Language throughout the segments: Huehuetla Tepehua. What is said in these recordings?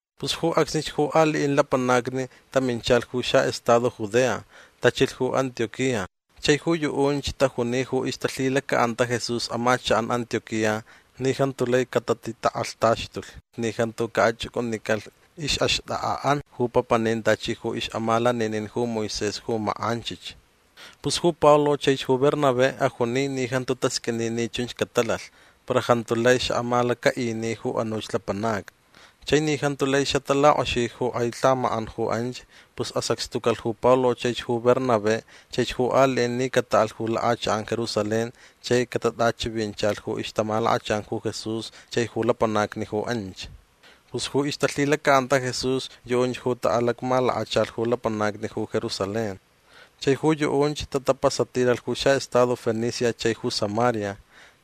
Pus ju acsnich ju aliʼin lapanacni taminchalh ju xaʼestado Judea. Tachilh ju Antioquía. Chai ju yuʼunch tajuni ju ixtalhilacaʼanta Jesús amachakʼan Antioquía ni jantu lai catatitakʼalhtaxtulh ni jantu caʼachʼucʼunicalh ixʼaxtʼakʼaʼan ju papanin tachi ju ixʼamalaninin ju Moisés ju makʼanchich. Pus ju Pablo chaich ju Bernabé ajuni ni jantu tasqʼuini ni chunch catalalh. Para jantu lai xaʼamalacaʼini ju anuch lapanacni. Chai ni jantu lai xatalakʼoxi ju kʼai lhamakʼan ju anch pus asacxtucalh ju Pablo chaich ju Bernabé chaich ju aliʼin ni cataʼalh ju lakʼachakʼan Jerusalén chai catatʼachivinchalh ju ixtamalakachan ju Jesús chai ju lapanacni ju anch. Pus ju ixtalhilacaʼanta Jesús yuʼunch ju taʼalacmalakachalh ju lapanacni ju Jerusalén. Chai ju yuʼunch tapasatilalh ju xaʼestado Fenicia chai ju Samaria.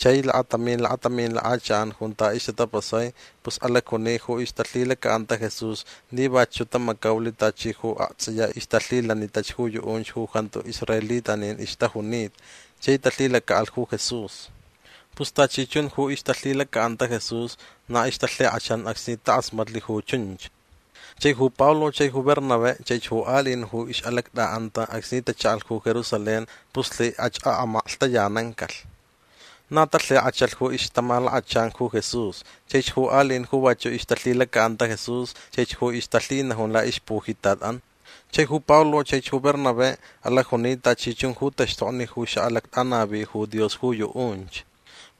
Chai lakatamin lakatamin lakʼachakʼan junta ixtatapasai pus alacjuni ju ixtalhilacaʼanta Jesús ni vachuʼ tamacaulh tachi ju aktsʼiya ixtalhilanitach ju yuʼunch ju jantu israelitanin ixtajunita chai talhilacaʼalh ju Jesús. Pus tachi chun ju ixtalhilacaʼanta Jesús na ixtalhikʼachan acsni takʼasmatlh ju chunch. Chai ju Pablo chai ju Bernabé chaich ju aliʼin ju ixʼalactʼaʼanta acsni tachaʼalh ju Jerusalén pus lhikʼach amaklhtayanancalh. Na talhikʼachalh ju ixtamalakachan ju Jesús chaich ju aliʼin ju vachuʼ ixtalhilacaʼanta Jesús chaich ju ixtalhinajun laʼixpujitatʼan. Chai ju Pablo chaich ju Bernabé alacjuni tachi chun ju taxtokni ju xaʼalactʼanavi ju Dios ju yuʼunch.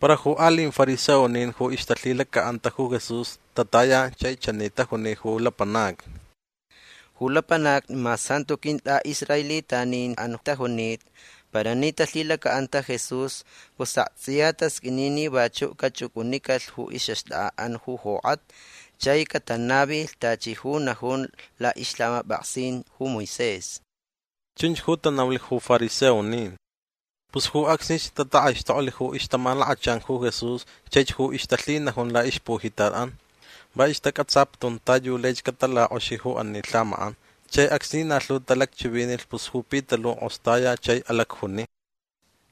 Para ju aliʼin fariseonin ju ixtalhilacaʼanta ju Jesús tataya chai chani tajuni ju lapanacni: ―Ju lapanacni mas jantu quintʼaʼisraelitaninʼan tajunita para ni talhilacaʼanta Jesús pus aktsʼiya tasqʼuini ni vachuʼ cachʼucʼunicalh ju ixʼaxtʼakʼaʼan ju jokʼatni chai catanavilh tachi ju najun laʼixlhamapʼaksin ju Moisés. ―Chunch ju tanaulh ju fariseonin. Pus ju acsnich tatakʼaixtoklh ju ixtamalakachan ju Jesús chaich ju ixtalhinajun laʼixpujitatʼan. Va ixtacʼatsaputun ta yu laich catalakʼoxi ju ani lhamakʼan. Chai acsni na lhu talacchivinilh pus ju Pitaluʼ kʼostaya chai alacjuni: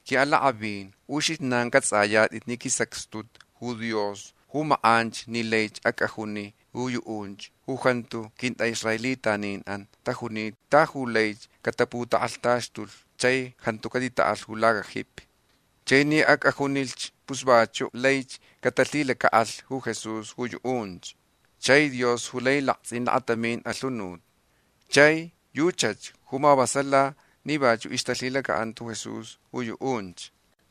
―Quiʼalakʼavin ju uxijnan cʼatsʼayatʼit ni quisacxtulh ju Dios ju makʼanch ni laich acʼajuni ju yuʼunch ju jantu quintʼaʼisraelitaninʼan tajunita ta yu lai cataputakʼalhtaxtulh chai jantu catitaʼalh ju lacajipi. Chai ni acʼajunilh pus vachuʼ laich catalhilacaʼalh ju Jesús ju yuʼunch. Chai Dios ju lai laktsʼin lakatamin alhunut. Chai yuchach ju mavasalalh ni vachuʼ ixtalhilacaʼanta Jesús ju yuʼunch.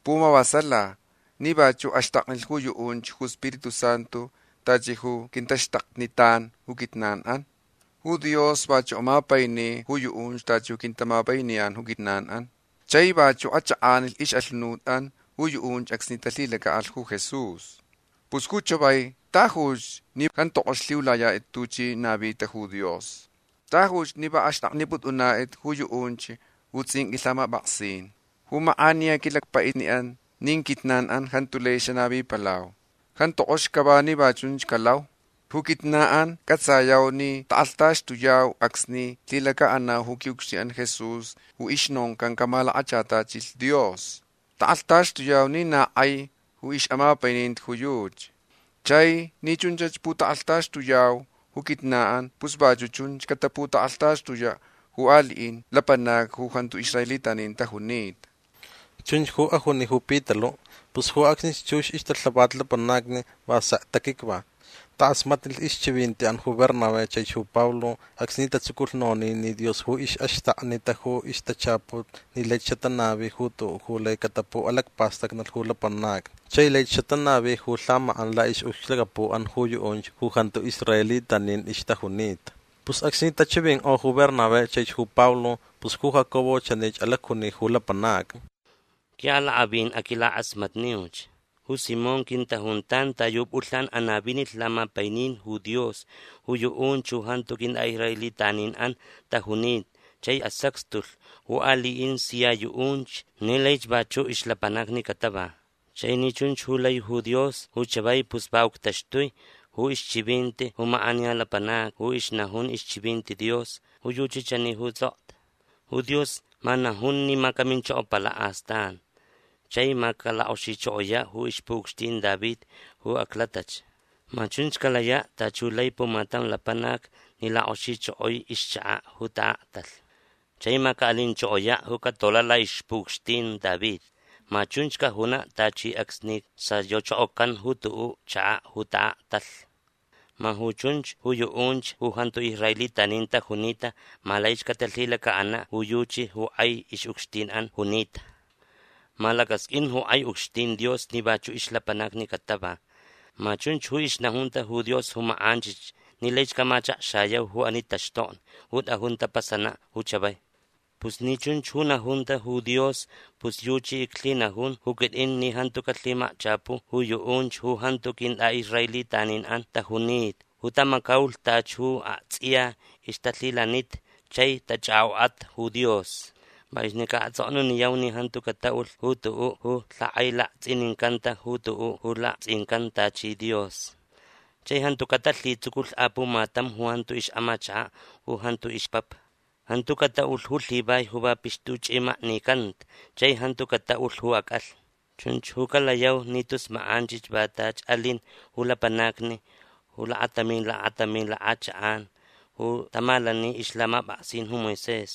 Pumavasala ni vachuʼ axtaknilh ju yuʼunch ju Spiritu Santu tachi ju quintaxtaknitan ju quijnanʼan. Ju Dios vachuʼ amapaini ju yuʼunch tachi ju quintamapainiyan ju quijnanʼan. Chai vachuʼ achʼakʼanilh ixʼalhunutʼan ju yuʼunch acsni talhilacaʼalh ju Jesús. Pus ju chavai tajuch ni jantu kʼox lhiulayatʼit tuchi navita ju Dios. Tajuch ni va axtʼaknipʼutʼunatʼit ju yuʼunch ju tsʼinqʼui lhamapʼaksin. Ju makʼaniya quilacpaʼitniʼan nin quijnanʼan jantu lai xanavipalau. Jantu kʼox cava ni va chunch calau. Ju quijnanʼan cʼatsayau ni takʼalhtaxtuyau acsni lhilacaʼanau ju quiʼucxtinʼan Jesús ju ixnoncan camalakachatachilh Dios. Takʼalhtaxtuyau ni na kʼai ju ixʼamapaininti ju yuchi. Chai ni chunch ju putakʼalhtaxtuyau ju quijnanʼan pus vachuʼ chunch cataputakʼalhtaxtuyaʼ ju aliʼin lapanacni ju jantu israelitanin tajunita. ―Chunch ju ajuni ju Pitaluʼ. Pus ju acsnich chux ixtalhavat lapanacni va sek taquicva. Takʼasmatnilh ixchivintiʼan ju Bernabé chaich ju Pablo acsni tatsuculh nonin ni Dios ju ixʼaxtaknita ju ixtachaput ni laich xatanavi ju tuʼuʼ ju lai catapuʼalacpastacnalh ju lapanacni chai laich xatanavi ju lhamakʼan laʼixʼucxlacapuʼan ju yuʼunch ju jantu israelitanin ixtajunita. Pus acsni tachivinkʼo ju Bernabé chaich ju Pablo pus ju Jacobo chanich alacjuni ju lapanacni: ―Quiʼalakʼavin aquilakʼasmatniuch. Ju Simón quintajuntan ta yu pʼulhnan anavinilh lamapainin ju Dios ju yuʼunch ju jantu quintʼaʼisraelitaninʼan tajunita chai asacxtulh ju aliʼin sia yuʼunch ni laich vachuʼ ixlapanacni catava. Chai ni chunch ju lai ju Dios ju chavai pus va uctaxtui ju ixchivinti ju makʼaniya lapanac ju ixnajun ixchivinti Dios. Ju yuchi chani ju tsʼokta: Ju Dios ma najun ni ma caminchokopalaʼ astan chai ma calakʼoxichokoyaʼ ju ixpuʼucxtin David ju aclatach. Ma chunch calayaʼ tachi ju lai pumatam lapanac ni lakʼoxichokoi ixchakaʼ ju taʼaktalh. Chai ma caʼalinchokoyaʼ ju catolaʼ laʼixpuʼucxtin David. Ma chunch cajunaʼ tachi acsni sayochokocan ju tuʼuʼ chakaʼ ju taʼaktalh. Ma ju chunch ju yuʼunch ju jantu israelitanin tajunita ma laich catalhilacaʼanaʼ ju yuchi ju kʼai ixʼucxtinʼan junita. Ma lacasqʼuin ju kʼai ucxtin Dios ni vachuʼ ixlapanacni catava. Ma chunch ju ixnajunta ju Dios ju makʼanchich ni laich camachakxayau ju ani taxtokni ju tʼajun tapasanaʼ ju chavai. Pus ni chunch ju najunta ju Dios pus yuchi iclhinajun ju quitʼin ni jantu calhimakchapu ju yuʼunch ju jantu quintʼaʼisraelitaninʼan tajunita ju tamacaulh tachi ju aktsʼiya ixtalhilanita chai tachʼakʼokʼata ju Dios. Va yuchi ni caʼatsʼoknuniyau ni jantu cataʼulh ju tuʼuʼ ju lhakʼailaktsʼinicanta ju tuʼuʼ ju laktsʼincan tachi dios. Chai jantu catalhitsuculh apumatam ju jantu ixʼamachakaʼ u jantu ixpapa. Jantu cataʼulh ju lhivai ju va pixtuchʼimaknicanta chai jantu cataʼulh ju acʼalhni. Chunch ju calayau ni tus makʼanchich va tachi alin ju lapanacni ju lakatamin lakatamin lakʼachakʼan ju tamalani ixlhamapʼaksin ju Moisés.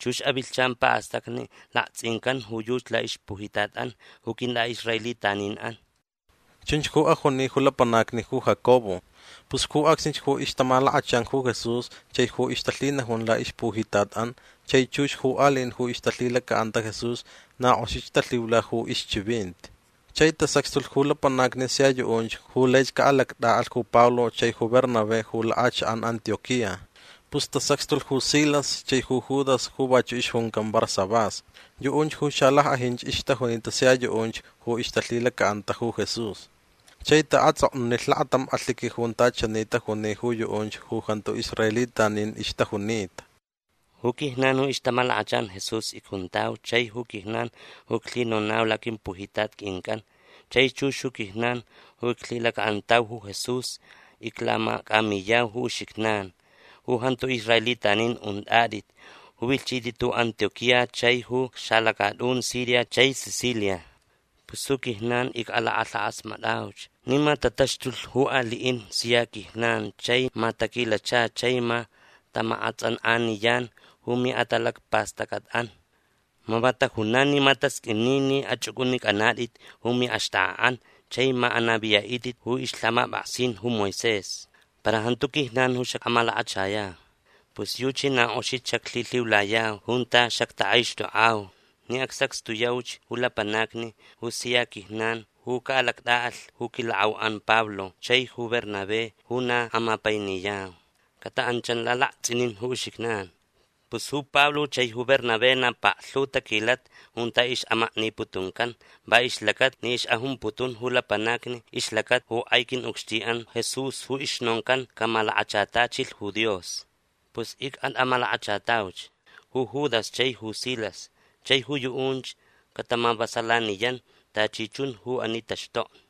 Chux avilhchan paʼastacni laktsʼincan ju yuchi laʼixpujitatʼan ju quintʼaʼisraelitaninʼan. ―Chunch ju ajuni ju lapanacni ju Jacobo. Pus ju acsnich ju ixtamalakachan ju Jesús chai ju ixtalhinajun laʼixpujitatʼan chai chux ju aliʼin ju ixtalhilacaʼanta Jesús na kʼoxich talhiula ju ixchivinti. Chai tasacxtulh ju lapanacni sia yuʼunch ju laich caʼalactʼaʼalh ju Pablo chai ju Bernabé ju lakʼachakʼan Antioquía. Pus tasacxtulh ju Silas chai ju Judas ju vachuʼ ixjuncan Barsabás. Yuʼunch ju xalackʼajinch ixtajunita sia yuʼunch ju ixtalhilacaʼanta ju Jesús. Chai taʼatsʼoknunilh lakatam alhiqui junta chani tajuni ju yuʼunch ju jantu israelitanin ixtajunita: “Ju quijnan ju ixtamalakachan Jesús icjuntau chai ju quijnan ju iclhinonau laquimpujitat quincʼan chai chux ju quijnan ju iclhilacaʼantau ju Jesús iclamacʼamiyau ju uxijnan ju jantu israelitanin untʼatʼit ju vilhchitʼit ju Antioquía chai ju xalacatʼun Siria chai Cilicia. Pus ju quijnan icʼalakʼalhakʼasmatʼauch ni ma tataxtulh ju aliʼin ju sia quijnan chai ma taquilacha chai ma tamakʼatsʼankʼaniyan ju miʼatalacpastʼacʼatʼan. Ma va tajunan ni ma tasqʼuini ni achʼucʼunicʼanatʼit ju miʼaxtʼakʼaʼan chai ma anaviyaʼitʼit ju ixlhamapʼaksin ju Moisés. Para jantu quijnan ju xacʼamalakachayau. Pus yuchi na kʼoxich xaclhilhiulayau junta xactakʼaixtʼokʼau ni acsacxtuyauch ju lapanacni ju sia quijnan ju caʼalactʼaʼalh ju quilakʼauʼan Pablo chaich ju Bernabé ju na amapainiyau. Cataʼanchan lalaktsʼinin ju uxijnan. Pus ju Pablo chai ju Bernabé na paklhu taquilata junta ixʼamakniputuncan va ixlacata ni ixʼajumputun ju lapanacni ixlacata ju kʼai quiʼucxtinʼan Jesús ju ixnoncan camalakachatachilh ju Dios. Pus icʼatʼamalakachatauch ju Judas chai ju Silas. Chai ju yuʼunch catamavasalaniyan tachi chun ju ani taxtokni.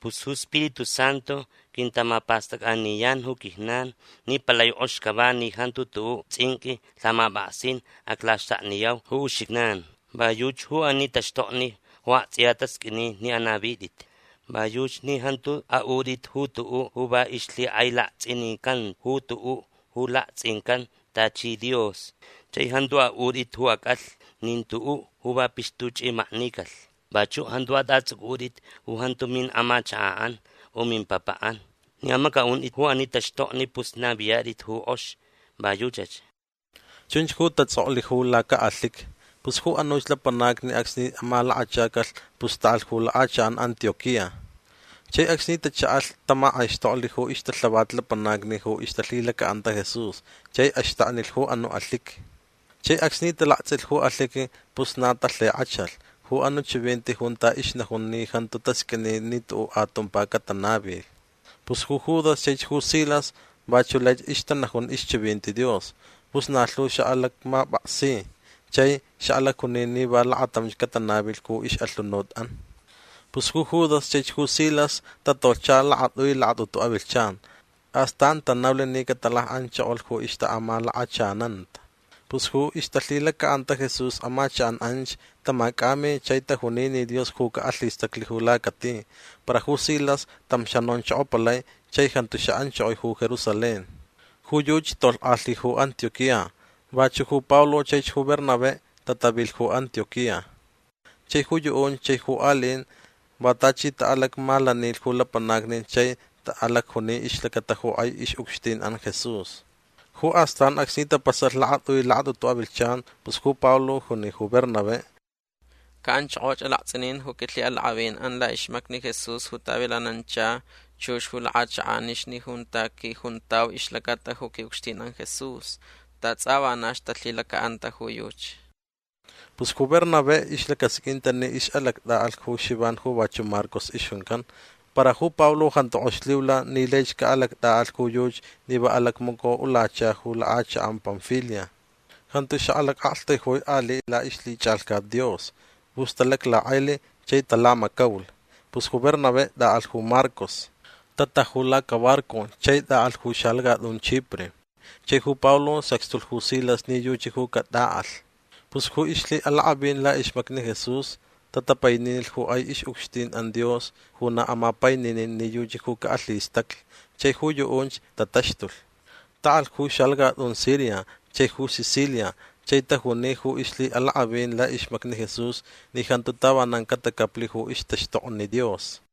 Pus ju Spiritu Santu quintamapastʼacʼaniyan ju quijnan ni palai kʼox cava ni jantu tuʼuʼ tsʼinqʼui lhamapʼaksin aclaxtakniyau ju uxijnan. Va yuchi ju ani taxtokni ju aktsʼiya tasqʼuini ni anavitʼit. Va yuchi ni jantu aʼutʼit ju tuʼuʼ ju va ixlhikʼailaktsʼinicanta ju tuʼuʼ ju laktsʼincan tachi dios. Chai jantu aʼutʼit ju acʼalhni nin tuʼuʼ ju va pixtuchʼimaknicalh. Vachuʼ jantu atʼatsʼucʼutʼit ju jantu miʼamachakaʼan u mimpapaʼan. Ni amacʼaʼuntʼit ju ani taxtokni pus naviyatʼit ju kʼox. Va yuchach”. Chunch ju tatsʼoklh ju lacaʼalhiqui. Pus ju anuch lapanacni acsni amalakachacalh pus taʼalh ju lakʼachakʼan Antioquía. Chai acsni tachaʼalh tamakʼaixtoklh ju ixtalhavat lapanacni ju ixtalhilacaʼanta Jesús chai axtaknilh ju anuʼ alhiqui. Chai acsni talaktsʼilh ju alhiqui pus na talhikʼachalh ju anuʼ chivinti junta ixnajun ni jantu tasqʼuini ni tuʼuʼ atumpa catanavilh. Pus ju Judas chaich ju Silas vachuʼ laich ixtanajun ixchivinti Dios. Pus na lhu xaʼalacmapʼaksi. Chai xaʼalacjuni ni va lakatamch catanavilh ju ixʼalhunutʼan. Pus ju Judas chaich ju Silas tatolhcha lakatʼui lakatʼutu avilhchan. Astan tanaulh ni catalakʼanchokolh ju ixtaʼamalakachananta. Pus ju ixtalhilacaʼanta Jesús amachakʼan anch tamacʼami chai tajuni ni Dios ju caʼalhistaclh ju lacati. Para ju Silas tam xanonchokopalai chai jantu xaʼanchokoi ju Jerusalén. Ju yuchi tolhkʼalhi ju Antioquía. Vachuʼ ju Pablo chaich ju Bernabé tatavilh ju Antioquía. Chai ju yuʼunch chai ju aliʼin va tachi taʼalacmalanilh ju lapanacni chai taʼalacjuni ixlacata ju kʼai ixʼucxtinʼan Jesús. Ju astan acsni tapasalh lakatʼui lakatʼutu avilhchan pus ju Pablo juni ju Bernabé: ―Caʼanchokoch alaktsʼinin ju quilhiʼalakʼavinʼan laʼixmacni Jesús ju tavilanancha chux ju lakʼachakʼanixni junta quijuntau ixlacata ju quiʼucxtinʼan Jesús. Ta tsʼa vanach talhilacaʼanta ju yuchi. Pus ju Bernabé ixlacasqʼuinta ni ixʼalactʼaʼalh ju Xivan ju vachuʼ Marcos ixjuncan. Para ju Pablo jantu kʼox lhiula ni laich caʼalactʼaʼalh ju yuchi ni va alacmacoʼulacha lakʼachakʼan Panfilia. Jantu xaʼalacʼaktaijui aliʼ laʼixlhichʼalhcat Dios. Pus talaclakʼailh chai talamacaulh. Pus ju Bernabé tʼaʼalh ju Marcos. Tataju lacabarco chai taʼalh ju xalacatʼun Chipre. Chai ju Pablo sacxtulh ju Silas ni yuchi ju catʼaʼalh. Pus ju ixlhiʼalakʼavin laʼixmacni Jesús tatapaininilh ju kʼai ixʼucxtinʼan Dios ju na amapaininin ni yuchi ju caʼalhistaclh. Chai ju yuʼunch tataxtulh. Taʼalh ju xalacatʼun Siria chai ju Cicilia chai tajuni ju ixlhiʼalakʼavin laʼixmacni Jesús ni jantu tavanan catacaplh ju ixtaxtokni Dios.